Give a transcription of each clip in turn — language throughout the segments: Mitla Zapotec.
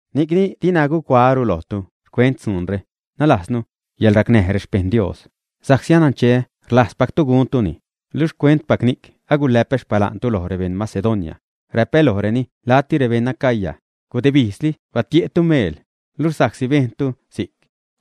Ni'cni dina gucuaäru lojtu xcuent dzuunre, nalajznu, yäḻracnäj rexpejṉ Dios, sa'csi anancheä rlajzpactu guntuni, luxh xcuentpac ni'c agulä'pä xpala'ntu loj rebeṉ Macedonia, räpä lojreni la'tu, rebeṉ Acaya, gudebijzli batie'tu meel, luxh sa'csi bejntu si'c,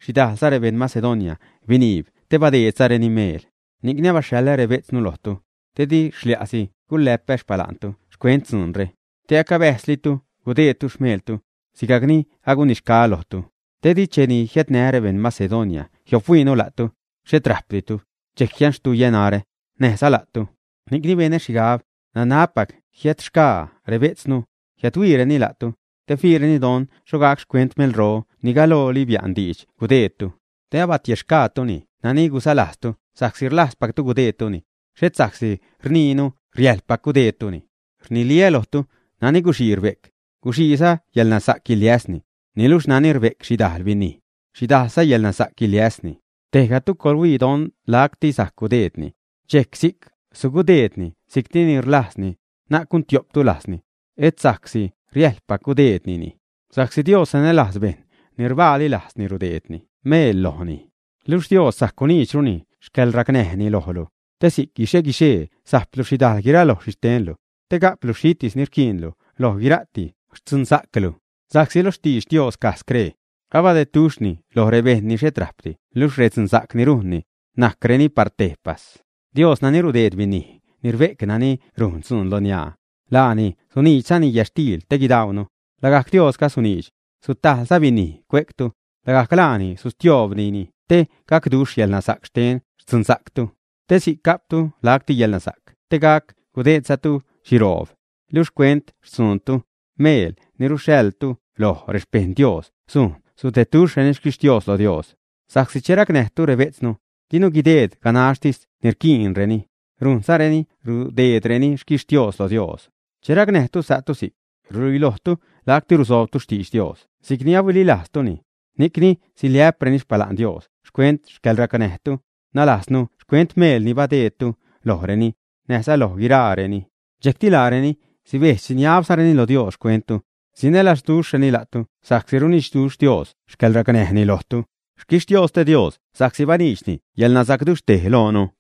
xhidajlza rebeṉ Macedonia biniib te badeedzareni meel. Ni'cni abaxhaḻä rebejtznu lojtu, te di xlia'si gulä'pä xpala'ntu xcuent dzuunre, te acabäjzlitu gudeedtu xmeeltu, sigajc ni agunixgaä lojtu. Didi che jiädnää́ rebeṉ Macedonia jiophuiinu la'tu, xhet rajpditu, dxejc jianxtuyä narä, näjza la'tu. Ni'cni benä xhigab, nanabpac jiädxgaa rebejtznu, jiädhuiireni la'tu, te fiireni don xho gac xcuent meelro ni galooli bia'n diidx gudeedtu, te abatiexgaatu nani gusalajztu sa'csi rlajzpactu gudeedtuni, xhet sa'csi rniinu riäjḻpac gudeedtuni. Rniliä lojtu, nani guxii rbe'c, guxiiza yälnasa'c guiliäsni, niluxh nani rbe'c xhidajl binij, xhidajlza yälnasa'c guiliäsni. Tejgatu coḻhuii don lacti sajc gudeedni, dxejc si'c sugudeedni si'cti ni rlajzni, na'c gun tiopdi lajzni, etza sa'csi riäjḻpac gudeednini, sa'csi Dios sanälajz bejṉ ni rbaali lajzni rudeedni meel lojni. Luxh Dios sajc guniidxru xcäḻracnäjni lojlu, te si'c guixe-guixee sajplu xhidajl guiraloj rexhixtenlu, te ga'plu xhitis ni rquiinlu loj guira'ti xtzunsa'clu. Sa'csi lo xtidx Dios caj scree: Abadeduxhni loj rebeṉ ni xhet rajpdi luxh redzunsa'c ni rujnni, najcreni par tejpas. Dios nani rudeed binij ni rbe'c nani rujn dzuun loniaa, laani suniidxzani yätxtiil te guidaunu, lagajc Diosga suniidx, sutajḻza binij cue'ctu, lagajc laani sustioobnini te gacduxh yälnasa'c xten xtzunsa'ctu. Te si'c ga'ptu lacti yäḻnasa'c te gac gudeedzatu xhiroob. Luxh xcuent xtzuunnu, meel ni ruxhaḻtu loj rexpejṉ Dios sujn gudedduxhreni xquixtios lo Dios. Sa'csi che racnäjtu rebejtznu, dinu guideed ganaxtis ni rquiinreni, rujnzanu rudeedrureni xquixtios lo Dios. Che racnäjtu sa'tu si'c, ruluilojtu lacti rusoobtu xtidx Dios si'cni ahuililajztuni, ni'cni siliä'preni xpala'n Dios xcuent xcäḻracnäjtu, nalajznu xcuent meel ni badeedtu lojreni, näjza loj guiraareni. Dxejcti laareni sibedx-siniabzareni lo Dios xcuenttu, sinälazduxhreni la'tu sa'csi runidxduxh Dios xcäḻracnäjni lojtu. ¡Xquixtiosti Dios sa'csi baniidxni yäḻnasa'cduxhtej loonu!